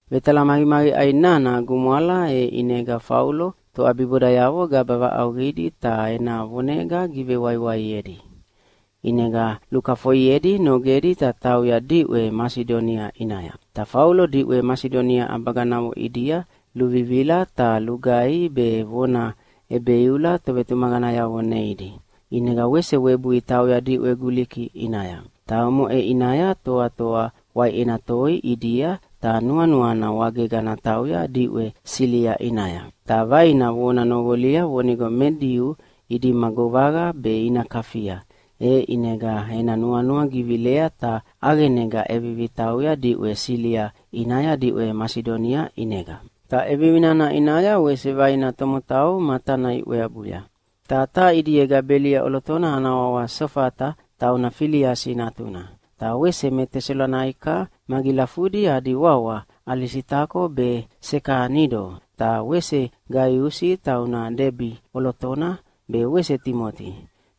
Vetalamaqimaqiʼai nana gumwala, e ʼinega Faulo toʼabibodayavo gaba vaʼauqidi ta ena vonega givewaiwaiedi. ʼInega lukafoiedi nogedi ta tauya diʼwe Masidonia ʼinaya. Ta Faulo diʼwe Masidonia ʼabaganavo ʼidia luvivila ta lugaihi be vona ʼebeiula tovetumaqanayavo neidi. ʼInega wese webui tauya diʼwe Guliki ʼinaya. Ta omoʼe ʼinaya toatoa waiʼena toi ʼidia ta nuanuana wagega natauya diʼwe Silia ʼinaya. Ta vaina vona noqolia vonigo me Diu idima govaqa be ina kafia, e ʼinega ena nuanua givilea ta ʼaqenega ʼevivi tauya diʼwe Silia ʼinaya diʼwe Masidonia ʼinega. Ta ʼevivi nana ʼinaya wese vaina tomotau matana iʼweabuya. Ta taha ʼidiega Belia ʼolotona ana wawa Sofata tauna Filiasi natuna, ta wese me Tesalonaika magilafudi adi wawa Alisitako be Sekanido, ta wese Gaiusi tauna Debi ʼolotona be wese Timoti.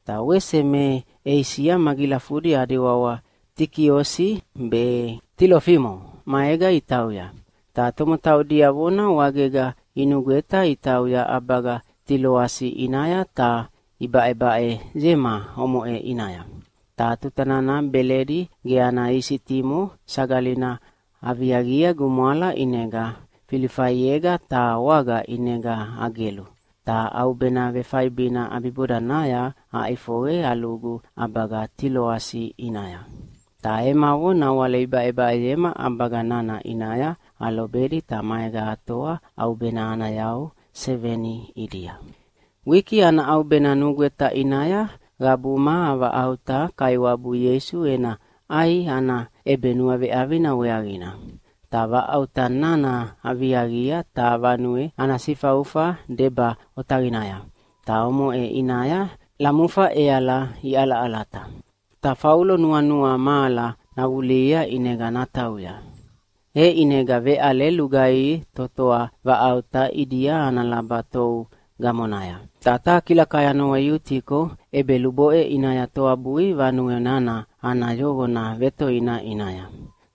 Ta wese me Eisia magilafudi adi wawa Tikiosi be Tilofimo maega itauya. Ta tomotau diavona wagega inugweta itauya ʼabaga Tiloasi ʼinaya ta ibaʼebaʼeyema omoʼe ʼinaya. Ta tuta nana Beledi ge ana isitimo Sagalina aviaqi gumwala ʼinega Filifaiega taha waga ʼinega agelu, ta ʼaubena vefaibina ʼabibodanaya aʼifoqe alugu ʼabaga Tiloasi ʼinaya. Ta emavo nawale ibaʼebaʼeyema ʼabaga nana ʼinaya alobedi ta maega atoa ʼaubena ana yau seveni ʼidia. Wiki ana ʼaubena nugweta ʼinaya qabuma avaʼauta Kaiwabu Ieisu ena ʼai ana ʼebenuaveʼavina weaqina. Ta vaʼauta nana aviaqia taha vanue ana sifaufa deba otaqinaya, ta omoʼe ʼinaya lamufa ʼeala iʼalaʼalata. Ta Faulo nuanua mahala navulihia ʼinega natauya, e ʼinega veʼale lugaihi totoa vaʼauta ʼidia ana laba tou gamonaya. Ta taha kilakai ana wawa Iutiko ʼebeluboʼe ʼinaya toabui vanue nana ana yoqona vetoina ʼinaya.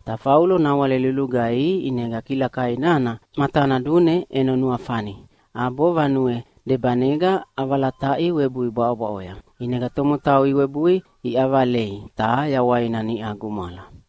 Ta Faulo nawale lulugaihi ʼinega kilakai nana matana dune ʼeno nuafani ʼabo vanue debanega ʼavalataʼia webui bwaʼobwaʼoya. ʼInega tomotau iwebui iʼavalei, ta yawaina niʼa gumwala.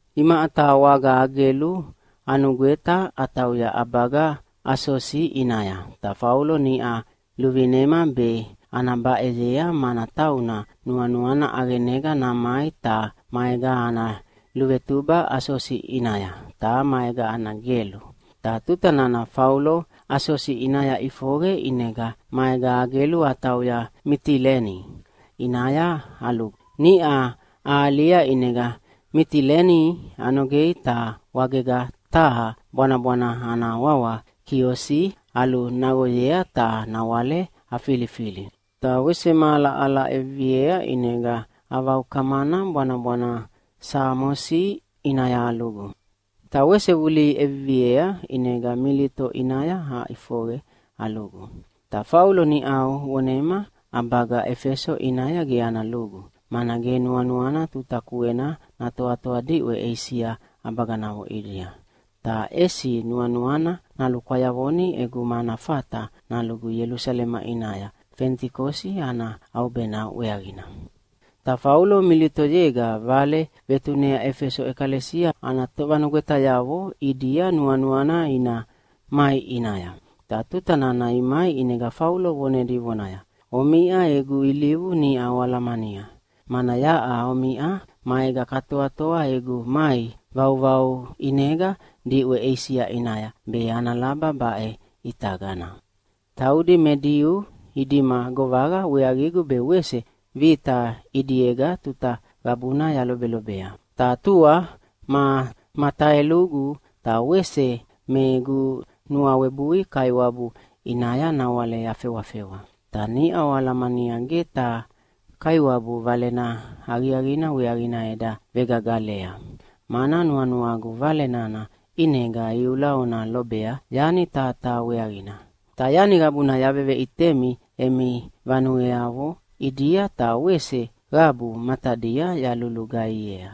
Imaʼa taha waga agelu anugweta atauya ʼabaga Asosi ʼinaya, ta Faulo niʼa luvinema be ana baʼeyea, mana tauna nuanuana ʼaqenega namai ta maega ana luvetuba Asosi ʼinaya, ta maega ana gelu. Ta tuta nana Faulo Asosi ʼinaya ʼifoqe ʼinega maega agelu atauya Mitileni ʼinaya alugu. Niʼa ahalia ʼinega Mitileni anogei ta wagega taha bwanabwana ana wawa Kiosi alunaqoyea ta nawale afilifili. Ta wese mahala ahala ʼeviviea ʼinega avaukamana bwanabwana Samosi ʼinaya alugu. Ta wese vulihi ʼeviviea ʼinega Milito ʼinaya aʼifoqe alugu. Ta Faulo niʼau vonema ʼabaga Efeso ʼinaya ge ana lugu, mana ge nuanuana tuta kuena natoatoa diʼwe Eisia ʼabaganavo ʼidia. Ta ʼesi nuanuana nalukwayavoni ʼeguma ana fata nalugu Ielusalema ʼinaya Fenitikosi ana ʼaubena weaqina. Ta Faulo Militoyega vale vetunea Efeso ʼekalesia ana tovanugwetayavo ʼidia nuanuana ina mai ʼinaya. Ta tuta nana imai ʼinega Faulo vonedi vonaya, “Omiʼa egu ilivu niʼa oalahalamania, mana yaʼa omiʼa maega katoatoa egu mai vauvau ʼinega diʼwe Eisia ʼinaya, be ana laba baʼe ʼitagana. Taudi me Diu idima govaqa weaqigu be wese vita ʼidiega tuta qabuna yalobelobea. Ta tua ma mataelugu ta wese me egu nuawebui Kaiwabu ʼinaya nawale yafewafewa. Ta niʼa oalamania ge taha Kaiwabu Valena Aqiaqina weaqina eda vegagalea, mana nuanuagu Vale nana ʼinega iula ona lobea yani taha taha weaqina. Ta yani qabuna yaveveʼitemi emi vanueavo ʼidia, ta wese qabu matadia yalulugaihiea.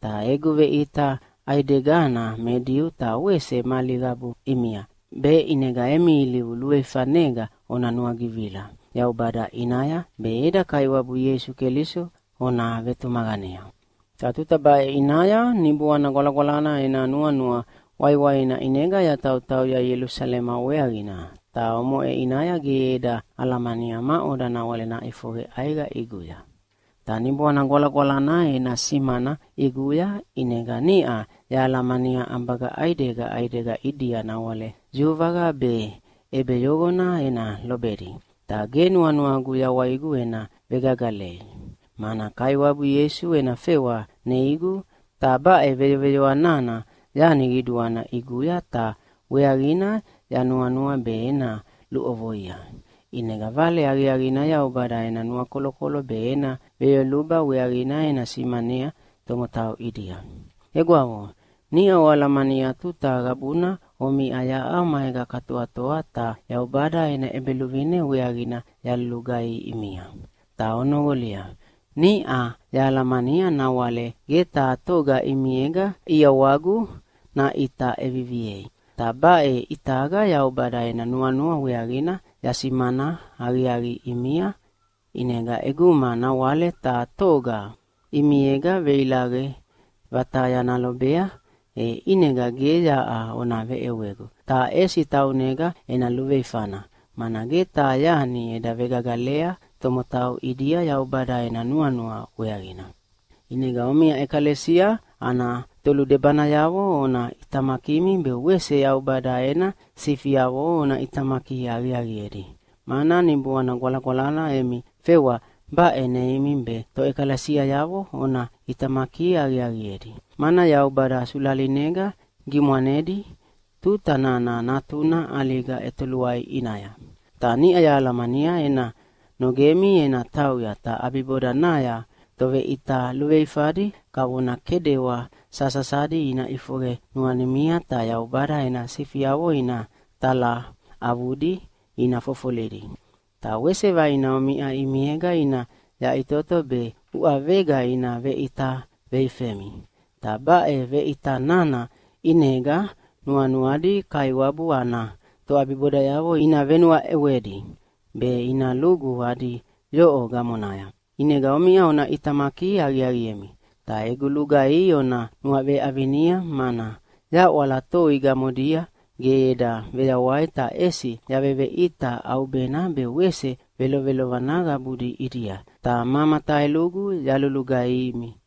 Ta egu veʼita ʼaidegana me Diu ta wese mali qabu ʼimia, be ʼinega emi ilivu luveifanega ona nuagivila Yaubada ʼinaya, be eda Kaiwabu Ieisu Keliso ona vetumaqanea. Ta tuta baʼe ʼinaya Niboana Gwalagwalana ena nuanua waiwaina ʼinega yatautauya Ielusalema weaqina, ta omoʼe ʼinaya ge eda alamania maʼoda nawale naʼifoqe ʼaiqa ʼiguya. Ta Niboana Gwalagwalana ena simana ʼiguya ʼinega niʼa yahalamania ʼabaga ʼaidega ʼaidega ʼidia nawale yuvaqa be ʼebeyoqona ena lobedi. Ta ge nuanuagu yawaigu ena vegagalei. Mana Kaiwabu Ieisu ena fewa neigu, ta baʼe veyoveyoa nana yani qiduana ʼiguya ta weaqina yanuanua be ena luʼovoia. ʼInega Vale Aqiaqina Yaubada ena nuakolokolo be ena veyoluba weaqina ena simanea tomotau ʼidia. “Egwavo, niʼa oalamania tuta qabuna omiʼa yaʼa maega katoatoa ta Yaubada ena ʼEbeluvine weaqina yalulugaihi ʼimia. Ta onoqolia, niʼau yahalamania nawale ge taha toga ʼimiega ʼiawagu naʼita ʼeviviei. Ta baʼe ʼitaga Yaubada ena nuanua weaqina yasimana aqiaqi ʼimia. ʼInega ʼeguma nawale taha toga ʼimiega veilaqe vataya nalobea, e ʼinega ge yaʼa ona veʼewegu, ta ʼesi taunega ena luveifana, mana ge taha yani eda vegagalea tomotau ʼidia Yaubada ena nuanua weaqina. ʼInega omiʼa ʼekalesia ana toludebanayavo ona ʼitamakimi be wese Yaubada ena sifiavo ona ʼitamaki aqiaqiedi, mana Niboana Gwalagwalana emi fewa baʼe neimi be toʼekalesiayavo ona ʼitamaki aqiaqiedi. Mana Yaubada sulalinega gimwanedi tuta nana Natuna ʼaliga ʼetoluai ʼinaya. Ta niʼa yahalamania ena nogemi ena tauya, ta ʼabibodanaya toveʼita luveifadi kavona kedewa sasasadi ina ʼifoqe nuanimia ta Yaubada ena sifiavo ina talaʼavudi ina fofolidi. Ta wese vaina omiʼa ʼimiega ina yaʼitoto be uʼavega ina veʼita veifemi, ta baʼe veʼita nana ʼinega nuanuadi Kaiwabu ana toʼabibodayavo ina venuaʼewedi be ina lugu adi yoʼo gamonaya. ʼInega omiʼa ona ʼitamaki aqiaqiemi. Ta egu lugaihi ona nuaveʼavinia, mana yaʼwala toi gamodia ge eda veyawai ta ʼesi yaveveʼita ʼaubena be wese velovelovana qabudi ʼidia, ta ma mataelugu yalulugaihimi.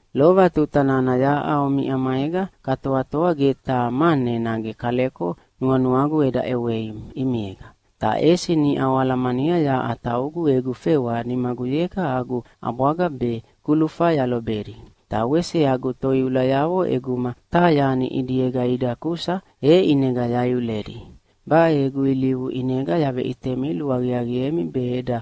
Lova tuta nana yaʼa omiʼa maega katoatoa ge taha mane nage kaleko nuanuagu eda ʼewei ʼimiega. Ta ʼesi niʼa oalamania yaʼa taugu egu fewa nimaguyega agu ʼabwaga be kulufa yalobedi. Ta wese agu toiulayavo ʼeguma taha yani ʼidiega ida kusa e ʼinega yaiuledi. Baʼe egu ilivu ʼinega yaveʼitemi luaqiaqiemi be eda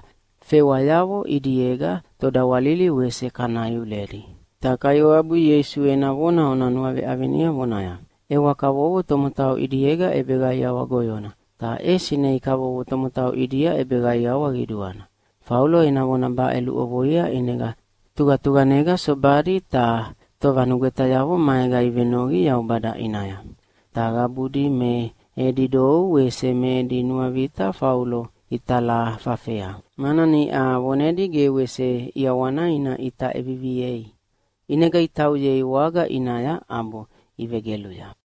fewayavo ʼidiega todawalili wese kana iuledi. Ta Kaiwabu Ieisu ena vona ona nuaveʼavinia vonaya, ‘ʼEwa kavovo tomotau ʼidiega ʼebeqaiawa goyona, ta ʼesi nei kavovo tomotau ʼidia ʼebeqaiawa qiduana.’” Faulo ena vona baʼe luʼovoia ʼinega tuqatuqanega sobadi ta tovanugwetayavo maega ivenoqi Yaubada ʼinaya. Ta qabudi me edi dou ta wese me edi nuavita Faulo italafafea, mana niʼa vonedi ge wese ʼiawana ina ʼita ʼeviviei. ʼInega itauyei waga ʼinaya ʼabo ivegeluya.